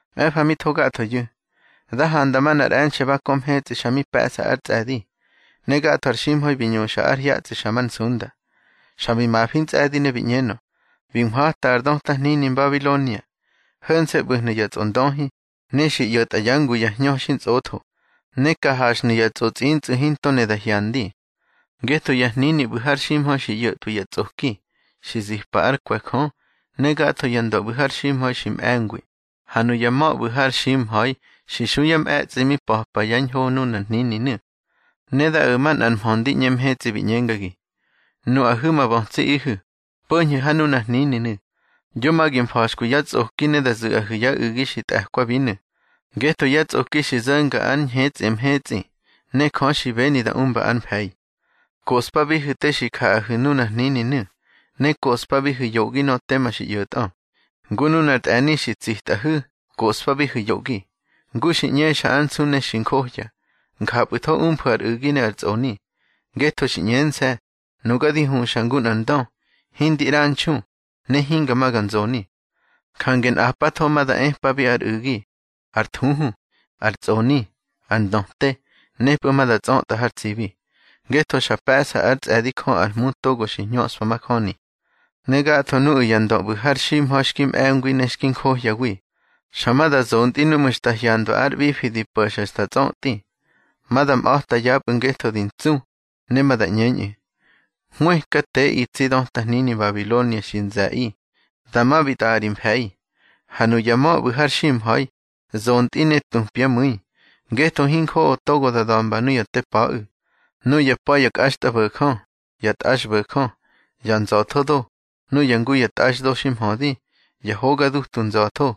Mꞌe̱fa mi tho gathoyu̱, da handa manꞌar e̱nxe̱ ba kö mhetsꞌi xa mi pe̱ꞌsa ár tsꞌe̱di, ne gatho ar ximha̱i bi ñuxa ár hyatsꞌi xa már nsunda. Xa bi mafi ntsꞌe̱di ne bi ꞌñenö: —Bi nhwata ar döta hnini Mbabilonia. Ho̱nse̱ ꞌbu̱hnu̱ ya tsꞌondöhi, ne xi ꞌyo̱tꞌa yá ngu ya hñö xintsꞌotho, ne ka haxhnu̱ ya tsꞌotsꞌintsꞌu̱ hinto ne da hyandi. Ngetho ya hnini ꞌbu̱ har ximha̱i xi ꞌyo̱tꞌwi ya tsꞌoki, xi zipa ár kwe̱ Jö. Ne gatho ya ndö ꞌbu̱ har ximha̱i xi mꞌe̱ngwi, ha nuya ma̱ ꞌbu̱ har ximha̱i xi xu yá mꞌe̱tsꞌi mi pa̱pa ya ñho nunar hnininu̱. Ne da o̱ manꞌar mhö ndi ꞌñe mhetsꞌi, bi ꞌñengagi: —Nuꞌahu̱ ma bötsiꞌihu̱, po̱ñhu̱ ha nunar hnininu̱, yo ma gi mfa̱xkwi yá tsꞌoki ne da zu̱ꞌahu̱ yá u̱gi xi tꞌe̱kwabinu̱. Ngetho yá tsꞌoki xi zo̱nga ár ñhetsꞌi mhetsꞌi, ne Jö xi beni da umba ar mfe̱i. Koꞌspabihu̱ te xi jaꞌahu̱ nunar hnininu̱, ne koꞌspabihu̱ yoꞌgi nöꞌö tema xi ꞌyo̱tꞌö. Ngu nunar tꞌe̱ni xi tsitꞌahu̱, koꞌspabihu̱ yoꞌgi. Ngu xi ꞌñexa ár nsu ne xi njohya, njapꞌu̱tho umfu̱ ar u̱gi ne ar tsꞌoni. Ngetho xi ꞌñense̱: Nuga di huxa ngu nꞌar ndö; hindi ꞌranxu, ne hinga ma ga nzoni. Jange nꞌapatho ma da epabi ar u̱gi, ar thuhu, ar tsꞌoni, ar ndöte, nepꞌu̱ ma da tsꞌötꞌa har tsibi, ngetho xa pe̱ꞌsa ár tsꞌe̱di Jö ar Hmu togo xi hñöꞌspa majöni. Ne gatho nuꞌu̱ ya ndö ꞌbu̱ har ximha̱i xki mꞌe̱ngwi ne xki njohyawi, xa ma da zontꞌi núꞌmu̱ xta hyandwa ár ꞌbifi di po̱xa xta tsötꞌi. Ma da mꞌa̱ta yapꞌu̱ ngetho di ntsu, ne ma da ꞌñeñꞌu̱: —Hwëkateꞌi tsi döta hnini Mbabilonia xi nze̱ꞌi. Dama bi tꞌa̱ꞌa ri mfe̱i. Ha nuya ma̱ ꞌbu̱ har ximha̱i, zontꞌi ne tupyá mu̱i, ngetho hinjoꞌo togo da da̱mba nuya te pa̱ꞌu̱. Nuya pa̱ ya kꞌaxtꞌabo̱jö, ya tꞌaxbo̱jö, ya nza̱thodo, nuya ngu ya tꞌaxdo xi mhödi, ya hoga dutu nza̱tho,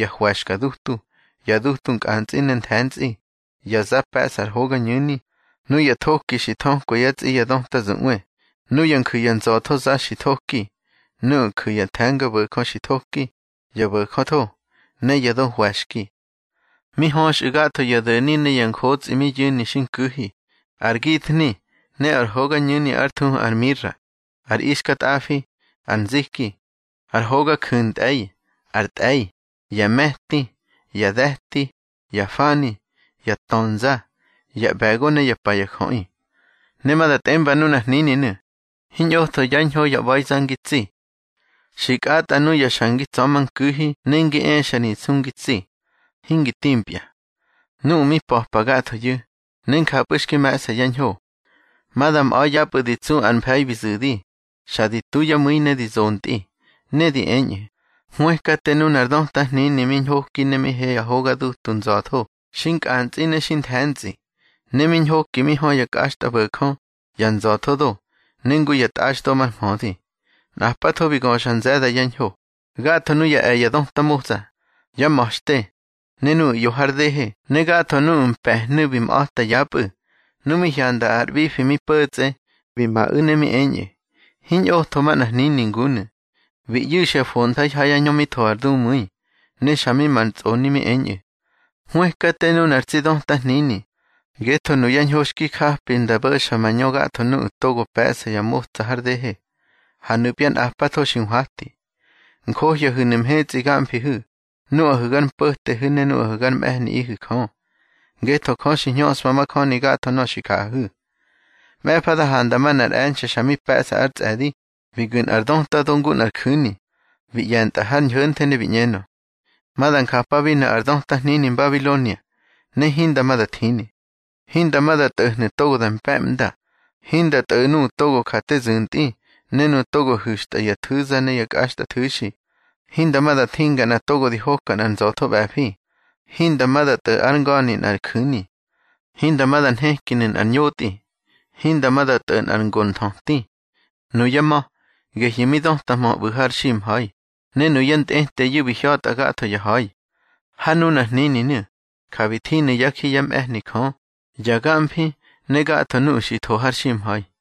ya hwe̱xka dutu, ya dutu nkꞌantsꞌi ne nthe̱ntsꞌi, ya za pe̱ꞌsa ar hogañu̱ni, nuya thoki xi thökwa yá tsꞌi ya döta zuꞌwe, nuya nju̱ ya nza̱thoza xi nthoki, nuꞌu̱ nju̱ ya the̱ngabo̱jö xi nthoki, ya bo̱jötho, ne ya do hwe̱xki. Mi höxꞌu̱ gatho ya do̱ni ne ya njotsꞌi mi yu̱ni xi nku̱hi, ar githni, ne ar hogañu̱ni ár thuhu ar mira, ar ixkatꞌafi, ar nziki, ar hoga ju̱ntꞌe̱i, ar tꞌe̱i, ya me̱ti, ya de̱ti, ya fani, ya ntönza, ya ꞌbe̱go, ne yá pa ya jöꞌi. Ne ma da tꞌemba nunar hnininu̱: —Hiñꞌotho yá ñho ya ꞌba̱iza ngi tsi. Xi kꞌatꞌa nuya xa ngi tsa̱manku̱hi ne ngi exa ri nsu ngi tsi, hingi timpya. Nuꞌu̱ mi pa̱pa gathoyu̱, ne njapꞌu̱ xki me̱ꞌsa yá ñho, ma da mꞌa̱ yapꞌu̱ di tsu ár mfe̱i bi zu̱di, xa di tu yá mu̱i ne di zontꞌi. Ne di eñꞌu̱: —Hwëkate nunar döta hnini mi ñhoki mi he ya hoga dutu nza̱tho xi nkꞌantsꞌi ne xi nthe̱ntsꞌi, ne mi ñhoki mi hö ya kꞌaxtꞌabo̱jö, ya nza̱tho do, ne ngu ya tꞌaxdo mar mhödi. Nꞌapatho bi göxa nze̱da ya ñho. Gatho nuya e̱ ya döta motsa, yá ma̱xte, ne nuꞌu̱ ꞌyo har dehe ne gatho nuꞌu̱ mpe̱hnu̱ bi mꞌa̱ta yapꞌu̱. Nu mi hyanda ar ꞌbifi mi po̱tsꞌe, bi maꞌu̱ ne mi eñꞌu̱: —Hiñꞌotho manꞌar hnini ngunu̱. Bi ꞌyu̱xya fontha̱i ha yá ñö mi tho ar dumu̱i, ne xa mi mar tsꞌoni mi eñꞌu̱: —Hwëkate nunar tsi döta hnini. Ngetho nuyá ñho xki japi nda bo̱xa mañö gatho nuꞌu̱ togo pe̱ꞌsa yá motsa har dehe, ha nupya nꞌapatho xi nhwati. Njohyahu̱nu̱ mhetsꞌi gamfihu̱, nuꞌahu̱ gár mpo̱tehu̱ ne nuꞌahu̱ gár mꞌe̱hniꞌihu̱ Jö. Ngetho Jö xi hñöꞌspa majöni gatho nöꞌö xi jaꞌahu̱. Mꞌe̱fa da handa manꞌar e̱nxe̱ xa mi pe̱ꞌsa ár tsꞌe̱di, bi gu̱ nꞌar döta do ngu nꞌar ju̱ni, bi ꞌye̱ntꞌa har ñho̱nthe ne bi ꞌñenö: —Ma da njapabinu̱ ar döta hnini Mbabilonia, ne hinda ma da thini. Hinda ma da tꞌo̱hnu̱ togo da mpe̱ꞌmda, hinda tꞌo̱ nuꞌu̱ togo ja te zu̱ntꞌi, ne nuꞌu̱ togo hu̱xtꞌa ya thu̱za ne ya kꞌaxtꞌathu̱xi. Hinda ma da thinga nꞌa togo di hoka nꞌar nza̱tho ꞌbe̱fi, hinda ma da tꞌo̱ ár nga̱ni nꞌar ju̱ni. Hinda ma da nhekinu̱ nꞌar ñotꞌi, hinda ma da tꞌo̱ nꞌar ngo nthöti. Nuyá ma̱, gehyu̱ mi dötahmö ꞌbu̱ har ximha̱i, ne nuyá ntꞌeteyu̱, bi hya̱tꞌa gatho ya ha̱i. Ha nunar hnininu̱, ja bi thinu̱ yá ji yá mꞌe̱hni Jö, ya gamfi ne gatho nuꞌu̱ xi tho har ximha̱i.